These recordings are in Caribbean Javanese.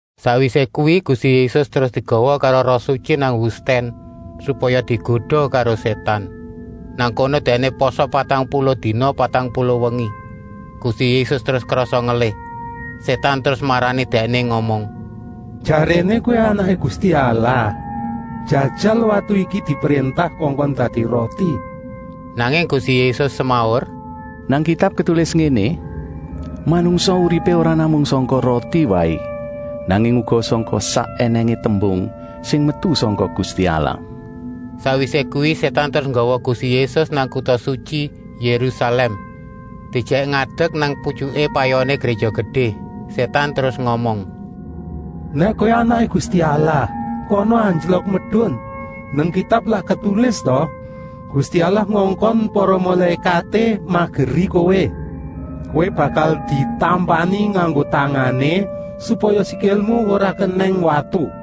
Sakwisé kuwi Gusti Yésus terus digawa karo Roh Sutyi nang wustèn, supaya digoda karo Sétan. Nang kono Dèkné pasa patang puluh dina patang puluh wengi. Gusti Yésus terus krasa ngelih. Sétan terus marani Dèkné ngomong: “Jaréné Kowé Anaké Gusti Allah? Jajal watu iki dipréntah kongkon dadi roti!” Nanging Gusti Yésus semaur: “Nang Kitab ketulis ngéné: ‘Manungsa uripé ora namung sangka roti waé, nanging uga sangka sak ènèngé tembung sing metu sangka Gusti Allah.’” Sakwisé kuwi Sétan terus nggawa Gusti Yésus nang kuta sutyi Yérusalèm, diejèk ngadek nang putyuké payoné Gréja Gedé. Sétan terus ngomong: “Nèk Kowé Anaké Gusti Allah, kana anjlok medun! Nang Kitab lak ketulis ta: ‘Gusti Allah ngongkon para mulékaté mageri kowé. Kowé bakal ditampani nganggo tangané, supaya sikilmu ora kenèng watu!’”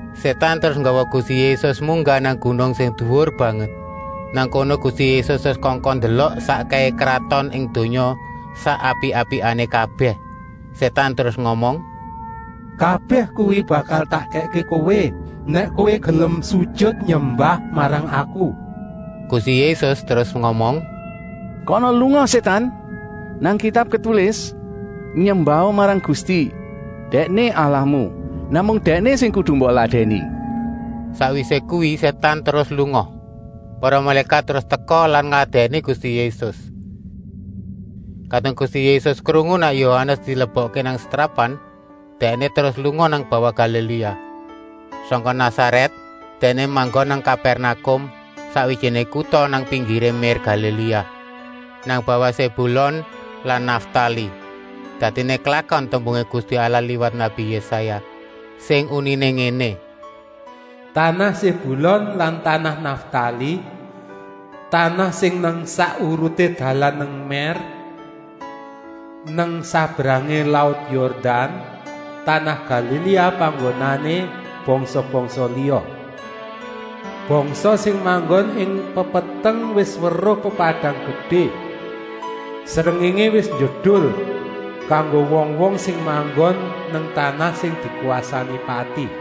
Sétan terus nggawa Gusti Yésus munggah nang gunung sing duwur banget. Nang kono Gusti Yésus terus kongkon ndelok sakkèhé kraton ing donya sak apik-apikané kabèh. Sétan terus ngomong: “Kabèh kuwi bakal tak kèkké Kowé, nèk Kowé gelem sujut nyembah marang Aku.” Gusti Yésus terus ngomong: “Kana lunga Sétan! Nang Kitab ketulis: ‘Nyembaha marang Gusti, Dèkné Allahmu. Namung Dèkné sing kudu mbok ladèni.’” Sakwisé kuwi Sétan terus lunga. Para mulékat terus teka lan ngladèni Gusti Yésus. Kadung Gusti Yésus krungu nèk Yohanes dilebokké nang setrapan, Dèkné terus lunga nang bawah Galiléa. Sangka Nasarèt Dèkné manggon nang Kapèrnakum, sakwijiné kuta nang pinggiré mér Galiléa, nang bawah Sébulon lan Naftali. Dadiné klakon tembungé Gusti Allah liwat nabi Yésaya, sing uniné ngéné: “Tanah Sébulon lan tanah Naftali, tanah sing nang sak uruté dalan nang mér, nang sabrangé laut Yordan, tanah Galiléa panggonané bangsa-bangsa liya. Bangsa sing manggon ing pepeteng wis weruh pepadang gedé. Srengéngé wis njedul kanggo wong-wong sing manggon nang tanah sing dikwasani pati.”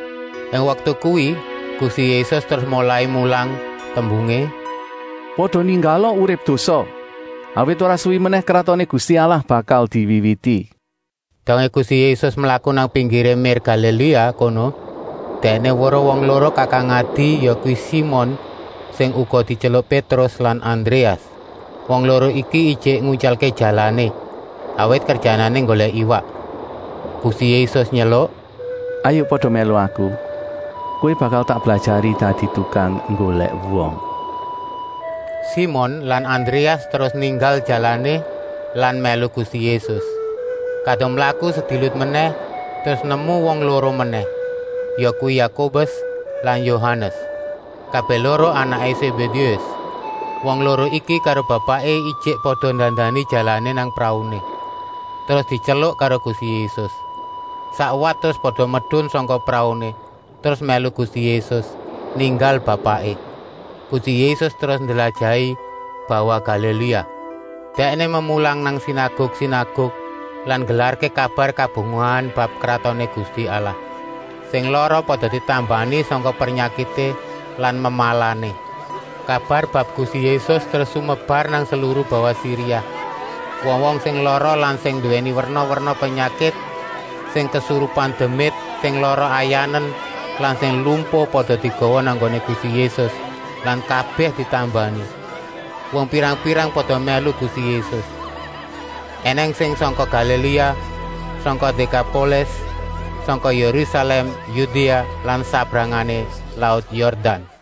Ing waktu kuwi Gusti Yésus terus molai mulang, tembungé: “Pada ninggala urip dosa, awit ora suwi menèh Kratoné Gusti Allah bakal diwiwiti.” Dongé Gusti Yésus mlaku nang pinggiré mér Galiléa kono, Dèkné weruh wong loro kakang-adi, yakuwi Simon sing uga dityeluk Pétrus lan Andréas. Wong loro iki ijik nguntyalké jalané, awit kerjanané nggolèk iwak. Gusti Yésus nyeluk: “Hayuk pada mèlu Aku. Kowé bakal tak blajari dadi tukang nggolèk wong.” Simon lan Andréas terus ninggal jalané lan mèlu Gusti Yésus. Kadung mlaku sedilut menèh terus nemu wong loro menèh, yakuwi Yakobus lan Yohanes, kabèh loro anaké Sébédéus. Wong loro iki karo bapaké ijik pada ndandani jalané nang prauné, terus dityeluk karo Gusti Yésus. Sakwat terus pada medun sangka prauné, terus mèlu Gusti Yésus, ninggal bapaké. Gusti Yésus terus ndlajahi bawah Galiléa. Dèkné memulang nang sinaguk-sinaguk lan nggelarké kabar kabungahan bab Kratoné Gusti Allah. Sing lara pada ditambani sangka pernyakité lan memalané. Kabar bab Gusti Yésus terus sumebar nang seluru bawah Siria. Wong-wong sing lara lan sing nduwé werna-werna pernyakit, sing kesurupan demit, sing lara ayanen lan sing lumpuh pada digawa nang nggoné Gusti Yésus lan kabèh ditambani. Wong pirang-pirang pada mèlu Gusti Yésus. Enèng sing sangka Galiléa, sangka Dékapolis, sangka Yérusalèm, Yudéa lan sabrangé laut Yordan.